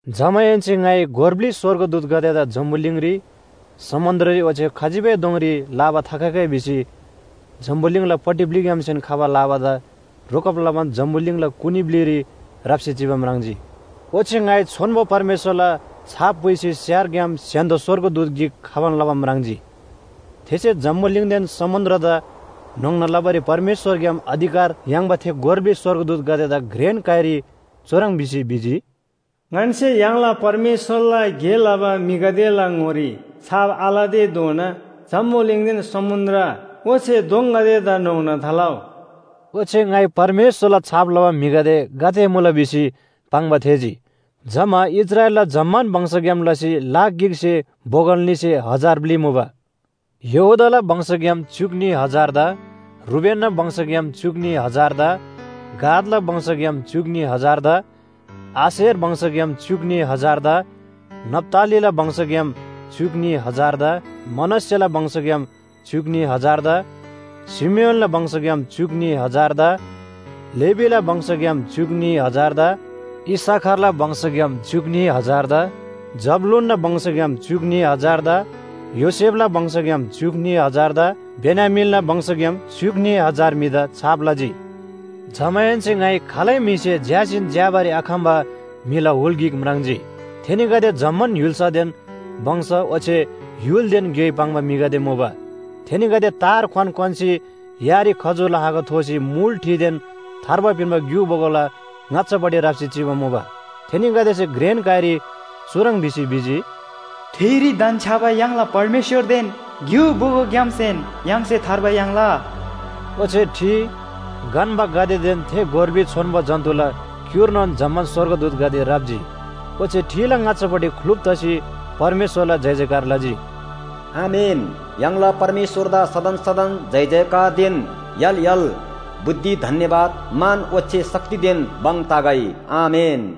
जमाहेन्‍से ङाइ गोर ब्‍लि स्‍वर्गदूतगदेदा जम्‍बुलिङरी, समुन्‍द्ररी ओच्‍छे खजिबै दोङरी लाबा थाखगै भिसी जम्‍बुलिङलापट्टि ब्‍लिग्‍यामसेन खबा लाबादा रोकब लबान जम्‍बुलिङला कुनी ब्‍लिरी राप्‍सी चिबा म्राङ्जी। ओच्‍छे ङाइ छोन्‍बो परमेश्‍वरला छाप पुइसी स्‍यारग्‍याम स्‍य्‍हान्‍दो स्‍वर्गदूत गिक खबान लबा म्राङ्जी। थेसे जम्‍बुलिङदेन समुन्‍द्रदा न्‍होङ्ना लबारी परमेश्‍वरग्‍याम अधिकार याङ्बा थे गोर ब्‍लि स्‍वर्गदूतगदेदा घ्रेन काइरी चुह्रङ् भिसी भिजी, “ङन्‍से य्‍हाङला परमेश्‍वरला गे लबा म्‍हिगदेला ङोरी छाप आलतेधोना जम्‍बुलिङदेन समुन्‍द्र ओच्‍छे दोङगदेदा न्‍होङ्ना थालउ।” ओच्‍छे ङाइ परमेश्‍वरला छाप लबा म्‍हिगदे गाते मुला भिसी पाङ्बा थेःजी। जमा इस्राएलला जम्‍मान वंशग्‍याम लसी लाख गिकसे बोगल न्‍हीसे हजार ब्‍लि मुबा। यहूदाला वंशग्‍याम च्‍युक न्‍ही हजारदा, रूबेनना वंशग्‍याम च्‍युक न्‍ही हजारदा, गादला वंशग्‍याम च्‍युक न्‍ही हजारदा, आशेर वंशग्‍याम च्‍युक न्‍ही हजारदा, नप्‍तालीला वंशग्‍याम च्‍युक न्‍ही हजारदा, मनश्‍शेला वंशग्‍याम च्‍युक न्‍ही हजारदा, शिमियोनला वंशग्‍याम च्‍युक न्‍ही हजारदा, लेवीला वंशग्‍याम च्‍युक न्‍ही हजारदा, इस्‍साखारला वंशग्‍याम च्‍युक न्‍ही हजारदा, जबूलूनना वंशग्‍याम च्‍युक न्‍ही हजारदा, योसेफला वंशग्‍याम च्‍युक न्‍ही हजारदा बेन्‍यामीनला वंशग्‍याम च्‍युक न्‍ही हजार म्‍हिदा छाप लजी। जमाहेन्‍से ङाइ खालै म्‍हिसे झ्‍यासीन झ्‍याबारी आखम्‍बा म्‍हिला हुल गिक म्राङ्जी। थेनीगदे जम्‍मान य्‍हुल्‍सादेन वंश ओच्‍छे य्‍हुलदेन ग्‍योइ पाङ्बा म्‍हिगदे मुबा। थेनीगदे तार क्‍वान क्‍वान्‍सी यारी खजूरला हाँगा थोसी मुल ठिदेन थार्बा पिन्‍बा ग्‍यु बोगोला ङाच्‍छापट्टि राप्‍सी चिबा मुबा। थेनीगदेसे घ्रेन काइरी चुह्रङ् भिसी भिजी, “ठिरी धन्‍छ्‌याबा य्‍हाङला परमेश्‍वरदेन ग्‍यु बोगोग्‍यामसेन य्‍हाङसे थार्बा याङ्ला।” ओच्‍छे ठि, गन्‍बागदेदेन थे गोर ब्‍लि छोन्‍बो जन्‍तुला क्‍युर्नोन जम्‍मान स्‍वर्गदूतगदे राप्‍जी, ओच्‍छे ठिला ङाच्‍छापट्टि ख्‍लुप तसी परमेश्‍वरला जयजयकार लजी। “आमेन! य्‍हाङला परमेश्‍वरदा सदन सदन जयजयकारदेन य्‍हाल य्‍हाल, बुद्धि, धन्‍यवाद, मान ओच्‍छे शक्तिदेन भङ तगै। आमेन!”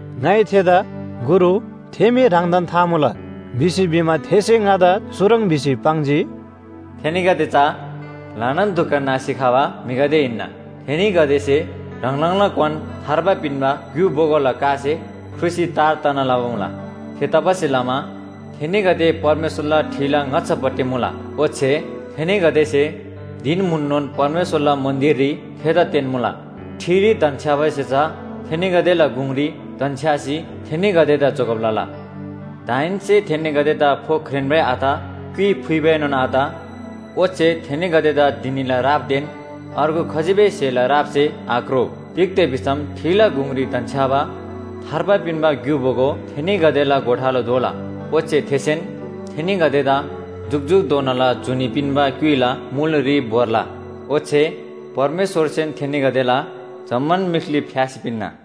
ङाइ थेदा “गुरु, थे मी ह्राङदान था मुला” भिसी भिमा थेसे ङादा चुह्रङ् भिसी पाङ्जी, “थेनीगदे चा ल्‍हानान दुख नासी खबा म्‍हिगदे हिन्‍ना। थेनीगदेसे ह्राङ ह्राङला क्‍वान थार्बा पिन्‍बा ग्‍यु बोगोला कासे ख्रुसी तार तना लबा मुला। थेतबासेलमा थेनीगदे परमेश्‍वरला ठिला ङाच्‍छापट्टि मुला, ओच्‍छे थेनीगदेसे धिन म्‍हुननोन परमेश्‍वरला मन्‍दिररी थेदा तेन्‍मुला। ठिरी धन्‍छ्‌याबासे चा थेनीगदेला गुङरी धन्‍छ्‌यासी थेनीगदेदा जोगब लला। दाहेन्‍से थेनीगदेदा फो ख्रेन्‍बै आत, क्‍युइ फुइबाएनोन आत। ओच्‍छे थेनीगदेदा धिनीला रापदेन अर्गु खजिबै स्‍हेला रापसे आक्रो। तिग्‍दा भिसम ठिला गुङरी धन्‍छ्‌याबा थार्बा पिन्‍बा ग्‍यु बोगो थेनीगदेला गोठालो दोला। ओच्‍छे थेसेन थेनीगदेदा जुकजुकधोनाला जुनी पिन्‍बा क्‍युइला मुलरी भोर्ला। ओच्‍छे परमेश्‍वरसेन थेनीगदेला जम्‍मान मीख्‍ली फ्‍यासी पिन्‍ना।”